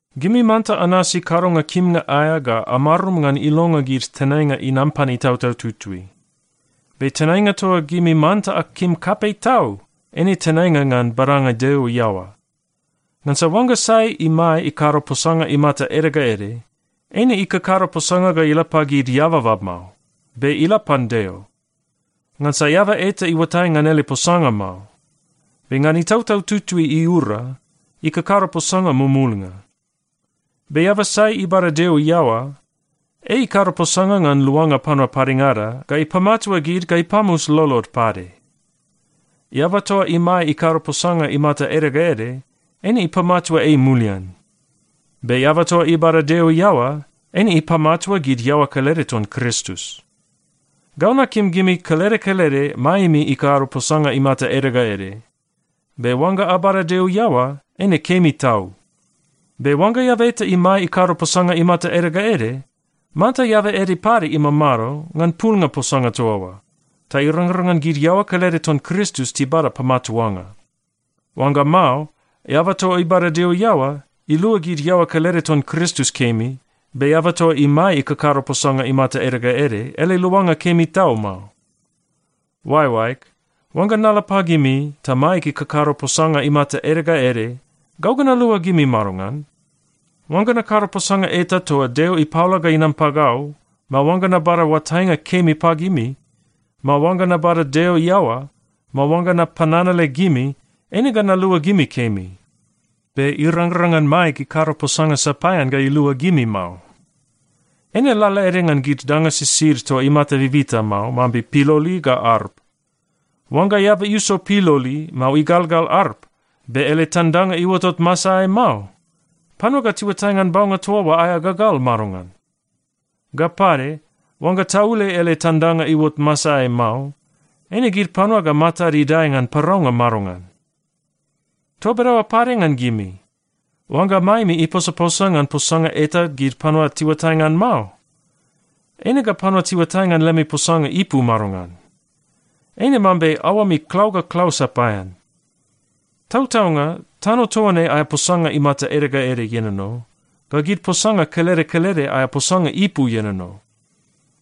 Gimi manta anasi kadonga kimnga aea ga amarum ngan ilonga gid tenainga inam pan Itautau Tutui. Be tenainga toa gimi manta akim kapei tau, eine tenainga ngan badanga Deo iaoa. Ngansa oangga sai imae ikado posanga imata ede ga ede, eine ikakado posanga ga ila pagid eababa mao, be ila pan Deo. Ngansa eaba eta iuatai ngan ele posanga mao, be ngan Itautau Tutui iura, ikakado posanga mumulnga. Be eaba sai ibada Deo iaoa, ei ikado posanga ngan luanga panua padengada ga ipamatua gid ga ipamus lolod pade. Eaba toa imae ikado posanga imata ede ga ede, eine ipamatua ei mulian. Be eaba toa ibada Deo iaoa, eine ipamatua gid iaoa kelede ton Kristus. Gau nakim gimi kelede kelede maemi ikado posanga imata ede ga ede. Be oangga abada Deo iaoa, eine kemi tau. Be oangga eaba eta imae ikado posanga imata ede ga ede, manta eaba ede pade imamado ngan pulnga posanga toa oa, ta irangrang ngan gid iaoa kelede ton Kristus tibada pamatuanga. Oangga mao, eaba toa ibada Deo iaoa, ilua gid iaoa kelede ton Kristus kemi, be eaba toa imae ikakado posanga imata ede ga ede, ele luanga kemi tau mao. Oaeoaeg, oangga nala pagimi ta maeg ikakado posanga imata ede ga ede, gau ga nalua gimi madongan? Oangga nakado posanga eta toa Deo ipaola ga inam pagau, mao oangga nabada oatainga kemi pagimi, mao oangga nabada Deo iaoa, mao oangga napananale gimi, eine ga nalua gimi kemi. Be irangrang ngan maeg ikado posanga sapaean ga ilua gimi mao. Eine lalaede ngan gid danga sisid toa imata bibita mao, mambe piloli ga arp. Oangga eaba iuso piloli, mao igalgal arp, be ele tandanga iuotot masaeai mao, panua ga tiuatai ngan baunga toa oa aea gagal madongan? Ga pade, oangga taule ele tandanga iuot masaeai mao, eine gid panua ga matad idae ngan paraunga madongan? Toa bedaoa pade ngan gimi. Oangga maemi iposaposa ngan posanga eta gid panua tiuatai ngan mao, eine ga panua tiuatai ngan lemi posanga ipu madongan? Eine mambe aoami klau ga klau sapaean. Tautaunga, tano toa ne aea posanga imata ede ga ede ienono, ga gid posanga kelede kelede aea posanga ipu ienono.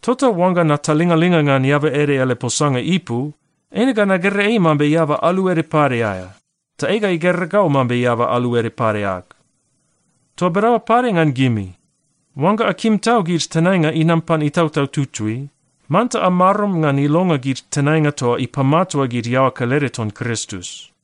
Tota oangga natalingalinga ngan eaba ede ele posanga ipu, eine ga nagera ei mambe eaba alu ede pade aea, ta ei ga igera gau mambe alu ede pade ag. Toa bedaoa pade ngan gimi. Oangga akim tau gid tenainga inam pan Itautau Tutui, manta amarum ngan ilonga gid tenainga toa ipamatua gid iaoa kelede ton Kristus.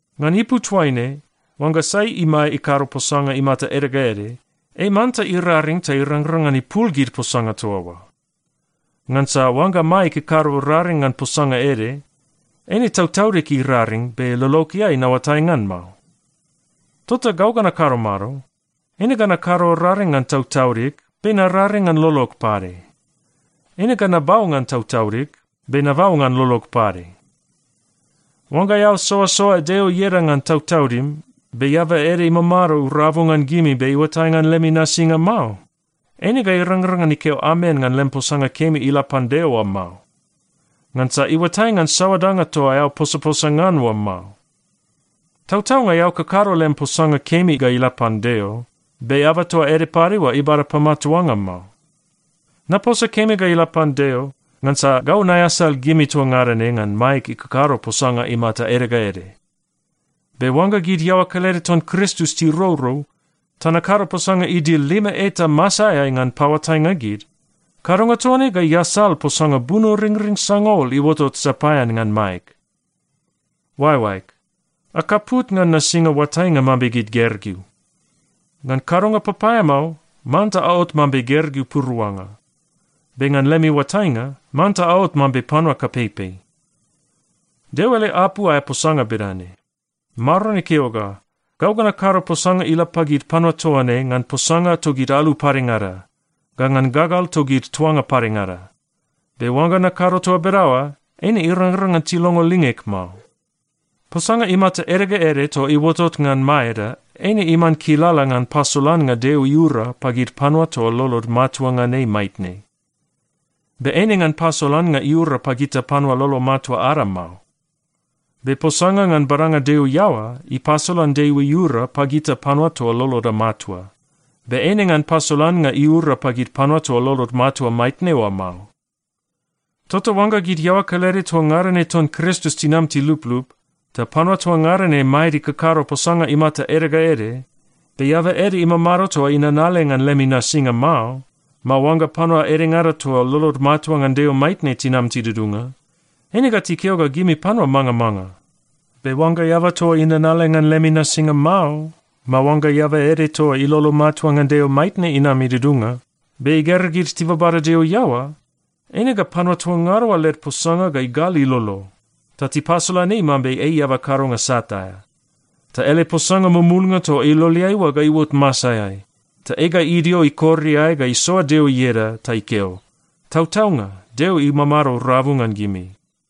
Ngan ipu toaine, oangga sai imae ikado posanga imata ede ga ede, ei manta iraring ta irangrang ngan ipul gid posanga toa oa. Ngansa oangga maeg ikado raring ngan posanga ede, eine tautaudig iraring, be lologeai naoatai ngan mao. Tota gau ga nakado mado? Eine ga nakado raring ngan tautaudig, be nararing ngan lolog pade. Eine ga nabau ngan tautaudig, be nabau ngan lolog pade. Oangga eao soasoa Deo ieda ngan tautaudim, be eaba ede imamado rabu ngan gimi be iuatai ngan lemi nasinga mao, eine ga irangrang ngan ikeo, “Amen,” ngan lem posanga kemi ila pan Deo oa mao, ngansa iuatai ngan saoa danga toa eao posaposa ngan oa mao. Tautaunga eao kakado lem posanga kemi ga ila pan Deo, be eaba toa ede pade oa ibada pamatuanga mao. Naposa kemi ga ila pan Deo ngansa gau naeasal gimi toa ngada ne ngan maeg ikakado posanga imata ede ga ede. Be oangga gid iaoa kelede ton Kristus tirourou, ta nakado posanga idil lima eta masaeai ngan paoatainga gid, kadonga toa ne ga iasal posanga bunoringring sangaul iuotot sapaean ngan maeg. Oaeoaeg, akaput ngan nasinga oatainga mambe gid gergeu. Ngan kadonga papaeamao, manta aot mambe gergeu puruanga, be ngan lemi oatainga, manta aot mambe panua kapeipei. Deo ele apu aea posanga bedane, “Maron ikeo ga, ‘Gau ga nakado posanga ila pagid panua toa ne ngan posanga togid alu padengada ga ngan gagal togid tuanga padengada. Be oangga nakado toa bedaoa, eine irangrang ngan tilongo lingeg mao.’” Posanga imata ede ga ede toa iuotot ngan maeda eine iman kilala ngan pasolannga Deo iura pagid panua toa lolod matua ngan ei maitne. Be eine ngan pasolannga iura pagita panua lolo matua ada mao. Be posanga ngan badanga Deo iaoa ipasolan Deo iura pagita panua toa loloda matua, be eine ngan pasolannga iura pagid panua toa lolod matua maitne oa mao. Tota oangga gid iaoa kelede toa ngada ne ton Kristus tinam tiluplup, ta panua toa ngada ne maed ikakado posanga imata ede ga ede, be eaba ede imamado toa inanale ngan lemi nasinga mao, mao oangga panua edengada toa lolod matua ngan Deo maitne tinam tidudunga, eine ga tikeo ga gimi panua mangamanga. Be oangga eaba toa inanale ngan lemi nasinga mao, mao oangga eaba ede toa ilolo matua ngan Deo maitne inam idudunga, be igera gid tibabada Deo iaoa, eine ga panua toa ngada oa led posanga ga igal ilolo, ta tipasolan ei mambe ei eaba kadonga sat aea. Ta ele posanga mumulnga toa iloleai oa ga iuot masaeai, ta ei ga idio ikor iae ga isoa Deo ieda ta ikeo, “Tautaunga, Deo imamado rabu ngan gimi!”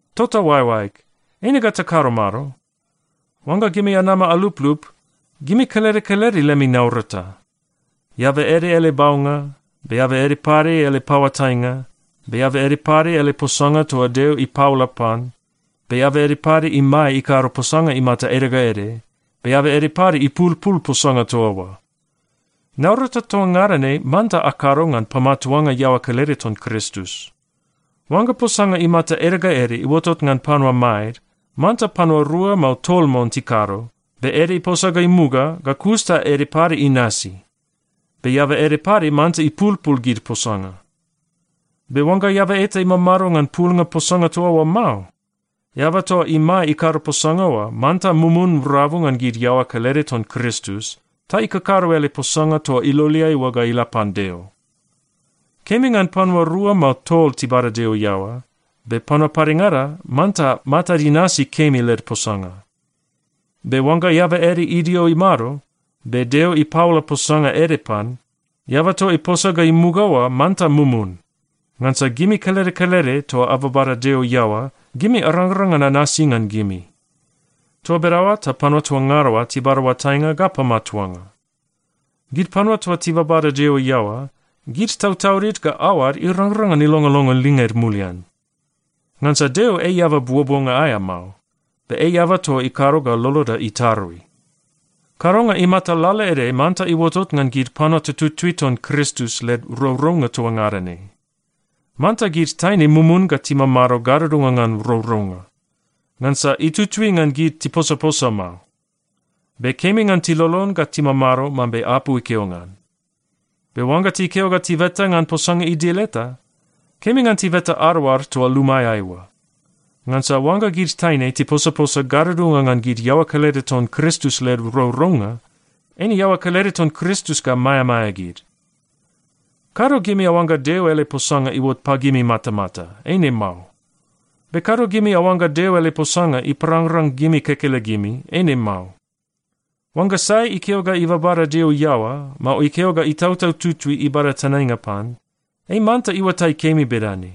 Tota oaeoaeg, eine ga takado mado? Oangga gimi anama aluplup, gimi kelede kelede lemi naurata. Eaba ede ele baunga, be eaba ede pade ele paoatainga, be eaba ede pade ele posanga toa Deo ipaola pan, be eaba ede pade imae ikado posanga imata ede ga ede, be eaba ede pade ipulpul posanga toa oa. Naurata toa ngada ne manta akado ngan pamatuanga iaoa kelede ton Kristus. Oangga posanga imata ede ga ede iuotot ngan panua maed, manta panua rua, mao tol mon tikado, be ede iposa ga imuga, ga kus ta ede pade inasi. Be eaba ede pade manta ipulpul gid posanga. Be oangga eaba eta imamado ngan pulnga posanga toa oa mao, eaba toa imae ikado posanga oa manta mumun rabu ngan gid iaoa kelede ton Kristus, ta ikakado ele posanga toa iloleai oa ga ila pan Deo. Kemi ngan panua rua mao tol tibada Deo iaoa, be panua padengada manta matad inasi kemi led posanga. Be oangga eaba ede idio imado, be Deo ipaola posanga ede pan, eaba toa iposa ga imuga oa manta mumun. Ngansa gimi kelede kelede toa ababada Deo iaoa, gimi arangrang ngan anasi ngan gimi. Toa bedaoa ta panua toa ngada oa tibada oatainga ga pamatuanga. Gid panua toa tibabada Deo iaoa, gid tautaudid ga aoad irangrang ngan ilongolongo linged mulian. Ngansa Deo ei eaba buobuonga aea mao, be ei eaba toa ikado ga loloda itarui. Kadonga imata lalaede manta iuotot ngan gid panua tututui ton Kristus led rourounga toa ngada ne. Manta gid taine mumun ga timamado gadudunga ngan rourounga. Ngansa itutui ngan gid tiposaposa mao. Be kemi ngan tilolon ga timamado mambe apu ikeo ngan. Be oangga tikeo ga tibeta ngan posanga idil eta, kemi ngan tibeta adaoad toa lumaeai oa. Ngansa oangga gid taine tiposaposa gadudunga ngan gid iaoa kelede ton Kristus led rourounga, eine iaoa kelede ton Kristus ga maeamaea gid. Kado gimi aoangga Deo ele posanga iuot pagimi matamata. Eine mao. Be kado gimi aoangga Deo ele posanga iparangrang gimi kekelegimi. Eine mao. Oangga sai ikeo ga ibabada Deo iaoa, mao ikeo ga Itautau Tutui ibada tenainga pan, ei manta iuatai kemi bedane: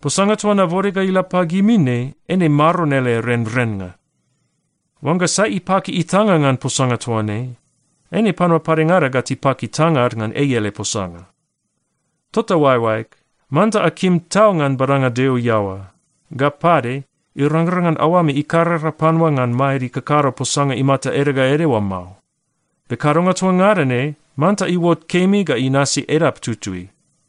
Posanga toa nabode ga ila pagimi ne, eine Maron ele renrennga. Oangga sai ipaki itanga ngan posanga toa ne, eine panua padengada ga tipaki tangad ngan ei ele posanga. Tota oaeoaeg, manta akim tau ngan badanga Deo iaoa. Ga pade irangrang ngan aoami ikarara panua ngan maed ikakado posanga imata ede ga ede oa mao. Be kadonga toa ngada ne manta iuot kemi ga inasi edap tutui.